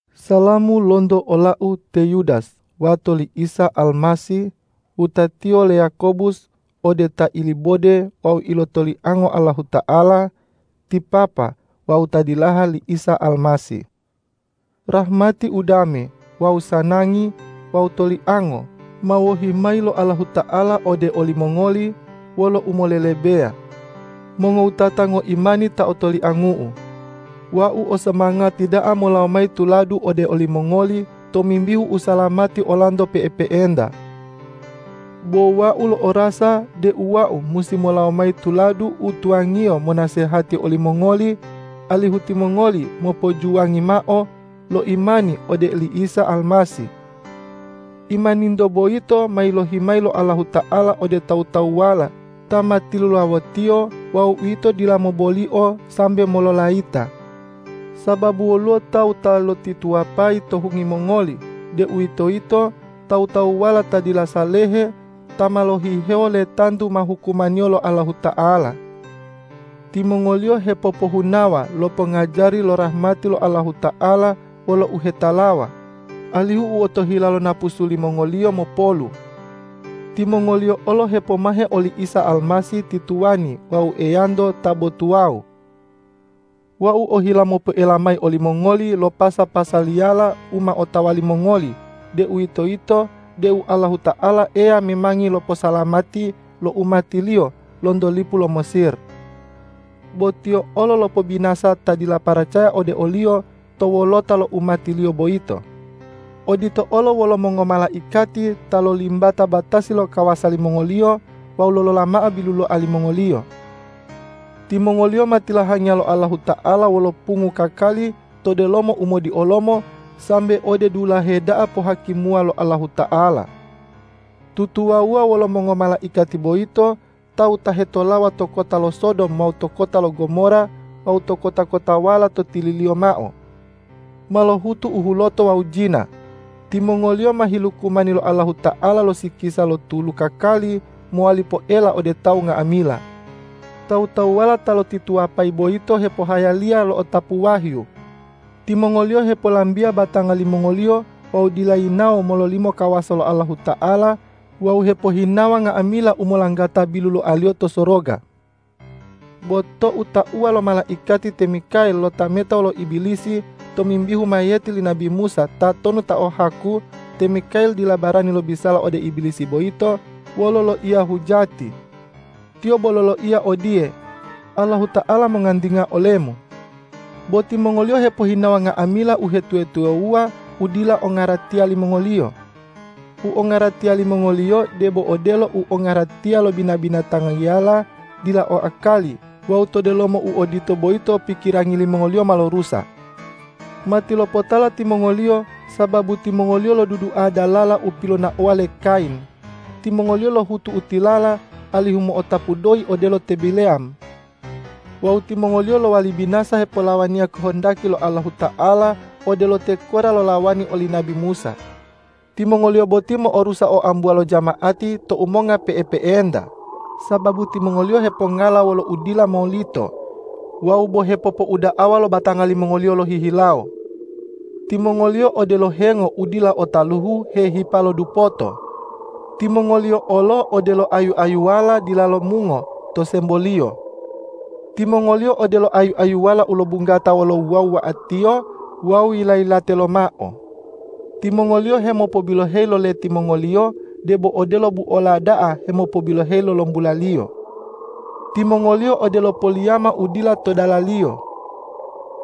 Salamu lonto olau te Yudas wato li Isa Almasih, wutatiyo le Yakobus ode ta ilibode wawu ilotoliango Allahuta'ala ti Papa wawu ta dilaha li Isa Almasih. Rahmati, udame wawu sanangi wawu toliango ma wohi mayi lo Allahuta'ala ode olimongoli wolo umolelebeya. Mongowutata ngoimani ta otoliangu'u, wau o somangati da'a molawo mayi tuladu ode olimongoli tomimbihu usalamati olanto pe'epe'enta. Bo wau lo'orasa deu wau musi molawo mayi tuladu u tuwangiyo monasehati olimongoli alihu timongoli mopojuwangi mao lo imani ode oli Isa Almasih. Imaninto boyito ma yilohi mayi lo Allahuta'ala ode tawu-tawuwala ta ma tilulawo-Tiyo wawu uwito dila mobolio sambe mololayita. Sababu woluwo tawu ta lotituwapayi to hungi mongoli, deuwitoyito tawu-tawuwala ta dila salehe ta ma lohihewo letantu ma hukumaniyo lo Allahuta'ala. Timongoliyo hepopohunawa lo pongajari lo rahmati lo Allahuta'ala wolo uhetalawa, alihu u otohila lo napusu limongoliyo mopolu. Timongoliyo olo hepomahe oli Isa Almasih ti Tuwani wawu Eyanto ta bo tuwawu. Wau ohila mopoela mayi olimongoli lo pasa-pasaliyala u ma otawa limongoli, deuwitoyito deu Allahuta'ala Eya memangi loposalamati lo umati-Liyo lonto lipu lo Mesir. Bo Tiyo olo lopobinasa ta dila paracaya ode o-Liyo to wolota lo umati-Liyo boyito. Odito olo wolo mongomalaikati ta lolimbata batasi lo kawasa limongoliyo wawu lolola mao biluloa limongoliyo.Timongoliyo ma tilahangiya lo Allahuta'ala wolo pungu kakali to delomo umodiolomo sambe ode dulahe da'a pohakimuwa lo Allahuta'ala. Tutuwawuwa wolo mongomalaikati boyito, tawu ta hetolawa to kota lo Sodom wawu to kota lo Gomora wawu to kota-kotawala to tililiyo mao, ma lohutu u huloto wawu jina. Timongoliyo ma hilukumani lo Allahuta'ala lo sikisa lo tulu kakali mowali poela ode tawu nga'amila. Tawu-tawuwala ta lotituwapayi boyito hepohayaliya lo'otapu wahyu. Timongoliyo hepolambia batanga limongoliyo wawu dila yinawo mololimo kawasa lo Allahuta'ala wawu hepohinawa nga'amila u molanggata biluloaliyo to soroga. Bo tou tauwa lo malaikati te Mikael lotameta wolo Ibilisi tomimbihu mayiyeti li nabi Musa tatonu ta o haku, te Mikael dila barani lobisala ode Ibilisi boyito wolo loiya hujati. Tiyo bo loloiya odiye,”Allahuta'ala mongantinga olemu!” Bo timongoliyo hepohinawa nga'amila uhetuwa-tuwawuwa u dila ongaratiya limongoliyo. U ongaratiya limongoliyo debo odelo u ongaratiya lo bina-binatangiyala dila o akali wawu to delomo u odito boyito pikirangi limongoliyo ma lorusa. Matilopotala timongoliyo, sababu timongoliyo lodudua dalala u pilonaowa le Kayin. Timongoliyo lohutu u tilala, alihu mo'otapu doyi odelo te Bileyam. Wawu timongoliyo lowali binasa hepolawaniya kohondaki lo Allahuta'ala, odelo te Korah lolawani oli nabi Musa. Timongoliyo boti mo'orusa oambuwa lo jama'ati tou monga pe'epe'enta, sababu timongoliyo hepongala wolo udila molito wawu bo hepopouda'awa lo batanga limongoliyo lohihilawo. Timongoliyo odelo hengo u dila o taluhu hehipa lo dupoto. Timongoliyo olo odelo ayu-ayuwala dila lomungo to semboliyo. Timongoliyo odelo ayu-ayuwala u lobunggata wolo wuwa-wuwa'atiyo wawu yila-yilate lomao. Timongoliyo hemopobiloheyi lo leti mongoliyo, debo odelo buola da'a hemopobiloheyi lo lombulaliyo. Timongoliyo odelo poliyama u dila to dalaliyo.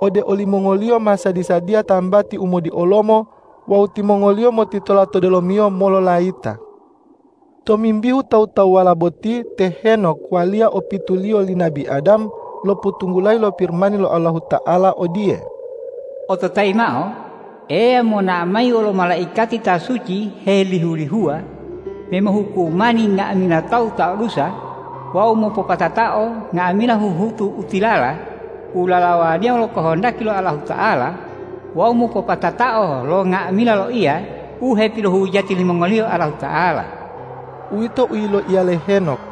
Ode olimongoliyo ma sadi-sadiya tambati u modiolomo wawu timongoliyo motitola to delomiyo mololayita. Tomimbihu tawu-tawuwala boti, te Henok waliya opituliyo li nabi Adam, lopotunggulayi lo Pirimani lo Allahuta'ala odiye,”Ototayi mao: Eya monao mayi wolo malaikati ta suci helihu-lihuwa me mohukumani nga'amila tawu ta o dusa wawu mopopatatao nga'amila huhutu u tilala u lalawaniya wolo kohondaki lo Allahuta'ala wawu mopopatatao lo nga'amila loiya u hepilohujati limongoliyo Allahuta'ala.” Uwito u yiloiya le Henok.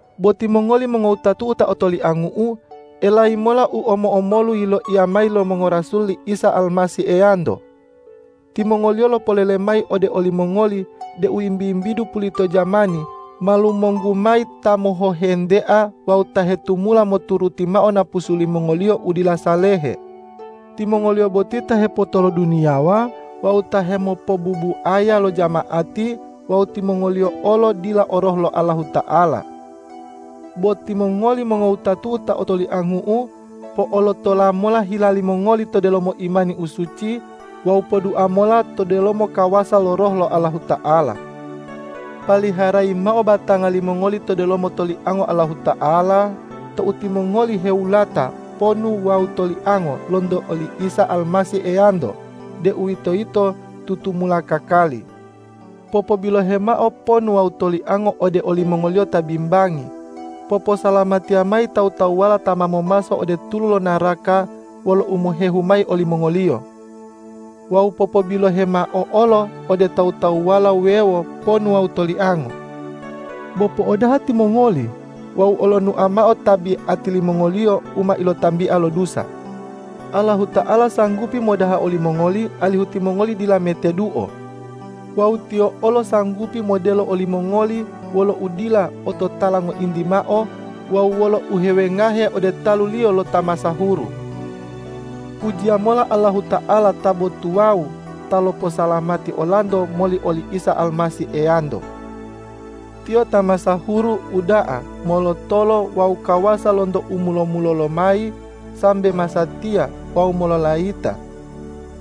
Bo timongoli mongowutatu'u ta otoliangu'u, elayi mola u omo-omolu yiloiya mayi lo mongorasul li Isa Almasih Eyanto. Timongoliyo lopolele mayi ode olimongoli deu wimbi-wimbidu pulito jamani ma lumonggu mayi ta mohohentea wawu ta hetumula moturuti mao napusu limongoliyo u dila salehe. Timongoliyo boti ta hepotoloduniyawa wawu ta hemopobubuaya lo jama'ati wawu timongoliyo olo dila o Roh lo Allahuta'ala. Bo timongoli mongowutatu'u ta otoliangu'u, po'olotola mola hila limongoli to delomo imani u suci wawu podua mola to delomo kawasa lo Roh lo Allahuta'ala. Paliharayi mao batanga limongoli to delomo toliango Allahuta'ala tou timongoli hewulata ponu wawu tolianga lonto oli Isa Almasih Eyanto, deuwitoyito tutumula kakali. Popobilohe mao ponu wawu toliango ode olimongoliyo ta bimbangi. Poposalamatiya mayi tawu-tawuwala ta ma momaso ode tulu lo naraka wolo umohehu mayi olimongoliyo. Wawu popobilohe mao olo ode tawu-tawuwala wuwewo ponu wawu toliango. Bo po'odaha timongoli wawu olonua mao tabiati limongoliyo u ma ilotambia lo dusa. Allahuta'ala sanggupi modaha olimongoli, alihu timongoli dila meteduo. Wawu Tiyo olo sanggupi modelo olimongoli wolo udila ototala ngointi mao wawu wolo uhewengahe ode talu-Liyo lo ta masahuru. Pujiya mola Allahuta'ala ta bo tuwawu ta loposalamati olanto moli oli Isa Almasih Eyanto. Tiyo ta masahuru, uda'a, molotolo wawu kawasa lonto u mulo-mulolo lomayi sambe masatiya wawu mololayita!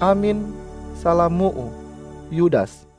Amin. Salamu'u, Yudas